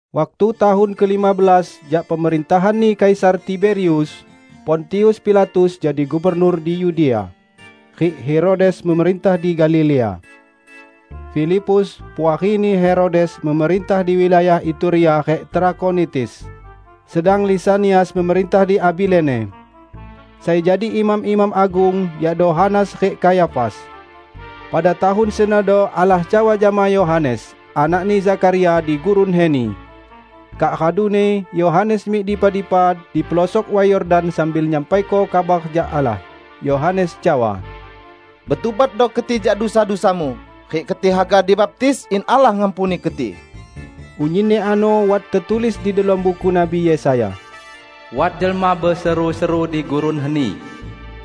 Waktu tahun kelima belas jak pemerintahanni Kaisar Tiberius, Pontius Pilatus jadi gubernur di Yudea, rik Herodes memerintah di Galilea. Filipus, puarini Herodes memerintah di wilayah Iturea rik Trakhonitis, sedang Lisanias memerintah di Abilene. Sai jadi imam-imam agung yakdo Hanas rik Kayafas. Pada tahun senodo Allah cawa jama Yohanes, anakni Zakharia di gurun heni. Kak raduni Yohanes mik dipa-dipa dipelosok Way Yordan sambil nyampaiko kabar jak Allah. Yohanes cawa, "Betubatdo keti jak dusa-dusamu, rik keti haga dibaptis, in Allah ngampuni keti." Unyinni ano wat tetulis di delom buku Nabi Yesaya: "Wat jelma beseru-seru di gurun heni,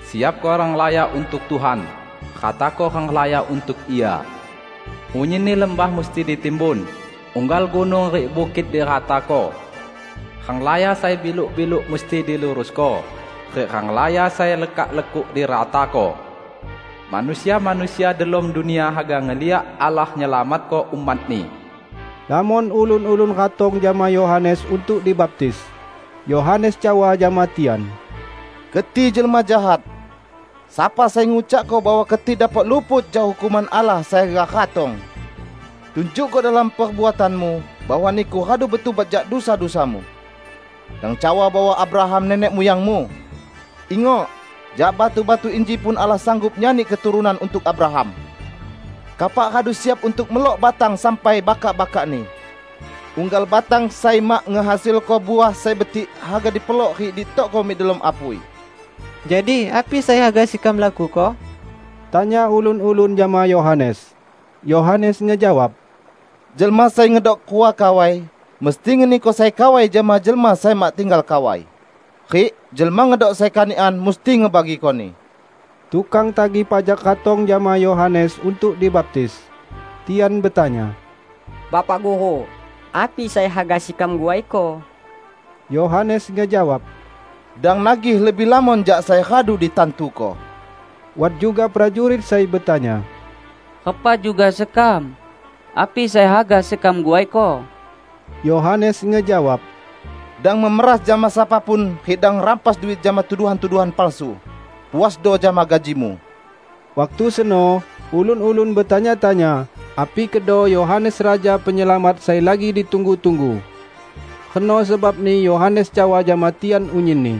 'Siapko renglaya untuk Tuhan, ratako renglaya untuk Ia. Unyinni lembah musti ditimbun, unggal gunung rik bukit diratako. Renglaya sai biluk-biluk musti dilurusko, rik renglaya sai lekak-lekuk diratako. Manusia-manusia delom dunia haga ngeliak Allah nyelamatko umat-Ni!' " Lamon ulun-ulun ratong jama Yohanes untuk dibaptis. Yohanes cawa jama tian, "Keti jelma jahat! Sapa sai ngucakko bahwa keti dapok luput jak hukuman Allah sai haga ratong? Tunjukko delom perbuatanmu bahwa niku radu betubat jak dusa-dusamu! Dang cawa bahwa Abraham nenek muyangmu. Ingok: Jak batu-batu inji pun Allah sanggup nyani keturunan untuk Abraham! Kapak radu siap untuk melok batang sampai bakak-bakakni. Unggal batang sai mak ngehasilko uah sai betik haga dipelok rik ditokko mik delom apui." "Jadi, api sai haga sekam lakuko?" tanya ulun-ulun jama Yohanes. Yohanes ngejawab, "Jelma sai ngedok rua kawai, mesti ngeniko sai kawai jama jelma sai mak tinggal kawai; rik jelma ngedok sai kanikan, musti ngebagikoni." Tukang tagih pajak ratong jama Yohanes untuk dibaptis. Tian betanya, "Bapak Guru, api sai haga sekam guaiko?" Yohanes ngejawab, "Dang nagih lebih lamon jak sai radu ditantuko." Wat juga prajurit sai betanya, "Repa juga sekam? Api sai haga sekam guaiko?" Yohanes ngejawab, "Dang memeras jama sapa pun rik dang ngerampas duit jama tuduhan-tuduhan palsu. Puasdo jama gajimu!" Waktu seno, ulun-ulun betanya-tanya, api kedo Yohanes Raja Penyelamat sai lagi ditunggu-tunggu. Reno sebabni Yohanes cawa jama tian unyinni,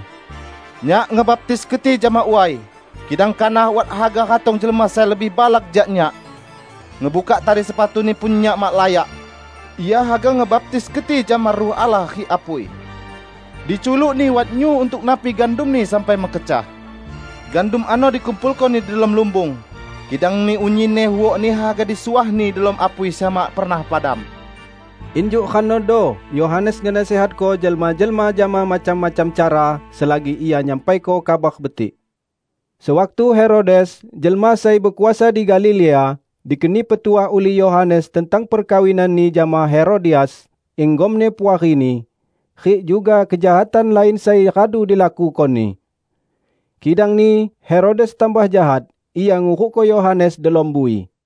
"Nyak ngebaptis keti jama way, kidang kanah wat haga ratong Jelma sai lebih balak jak nyak. Ngebukak tali sepatu-Ni pun nyak mak layak. Ia haga ngebaptis keti jama Ruh Allah rik apui. Diculuk-Ni wat nyu untuk napi gandumni sampai mekecah. Gandum ano dikumpulko-Ni delom lumbung, kidangni unyinni huokni haga disuah-Ni delom apui sai mak pernah padam!" Injuk renodo Yohanes ngenasihatko jelma-jelma jama macam-macam cara selagi ia nyampaiko Kabar Betik. Sewaktu Herodes, jelma sai bekuasa di Galilea, dikeni petuah ulih Yohanes tentang perkawinanni jama Herodias, inggomni puarini, rik juga kejahatan lain sai radu dilakukoni. Kidangni Herodes tambah jahat, ia ngurukko Yohanes delom bui.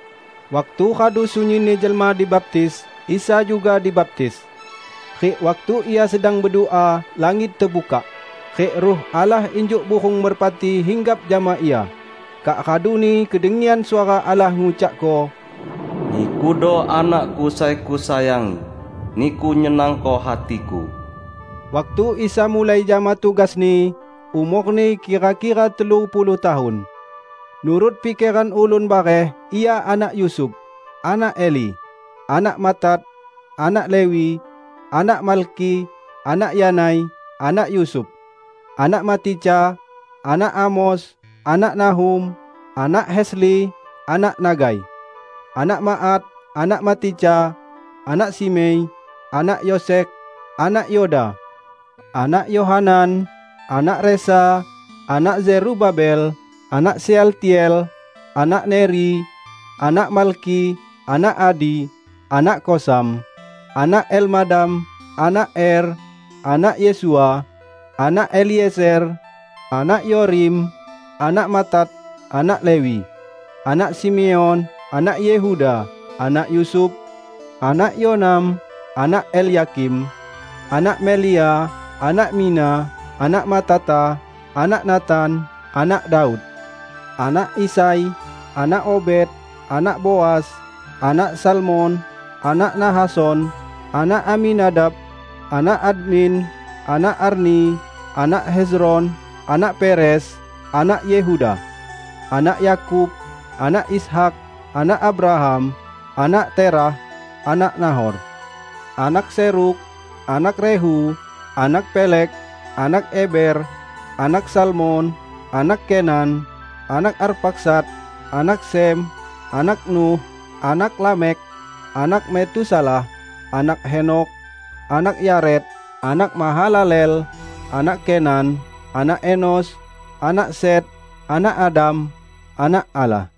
Waktu radu sunyinni jelma dibaptis, Isa juga dibaptis. Rik waktu Ia sedang bedua, langit tebukak, rik Ruh Allah injuk burung merpati hinggap jama Ia. Kak raduni kedengian suara Allah ngucakko, "Nikudo Anak-Ku sai Kusayangi. Niku nyenangko hati-Ku." Waktu Isa mulai jama tugas-Ni, umor-Ni kira-kira telu puluh tahun. Nurut pikeran ulun bareh, Ia anak Yusuf, anak Eli, anak Matat, anak Lewi, anak Malkhi, anak Yanai, anak Yusuf, anak Matica, anak Amos, anak Nahum, anak Hesli, anak Nagai, anak Maat, anak Matica, anak Simei, anak Yosekh, anak Yoda, anak Yohanan, anak Resa, anak Zerubabel, anak Sealtiel, anak Neri, anak Malkhi, anak Adi, anak Kosam, anak Elmadam, anak Er, anak Yesua, anak Eliezer, anak Yorim, anak Matat, anak Lewi, anak Simeon, anak Yehuda, anak Yusuf, anak Yonam, anak Elyakim, anak Melea, anak Mina, anak Matata, anak Natan, anak Daud, anak Isai, anak Obed, anak Boas, anak Salmon, anak Nahason, anak Aminadab, anak Admin, anak Arni, anak Hezron, anak Peres, anak Yehuda, anak Yakub, anak Ishak, anak Abraham, anak Terah, anak Nahor, anak Serug, anak Rehu, anak Peleg, anak Eber, anak Salmon, anak Kenan, anak Arpakhsad, anak Sem, anak Nuh, anak Lamekh, anak Metusalah, anak Henokh, anak Yared, anak Mahalaleel, anak Kenan, anak Enos, anak Set, anak Adam, anak Allah.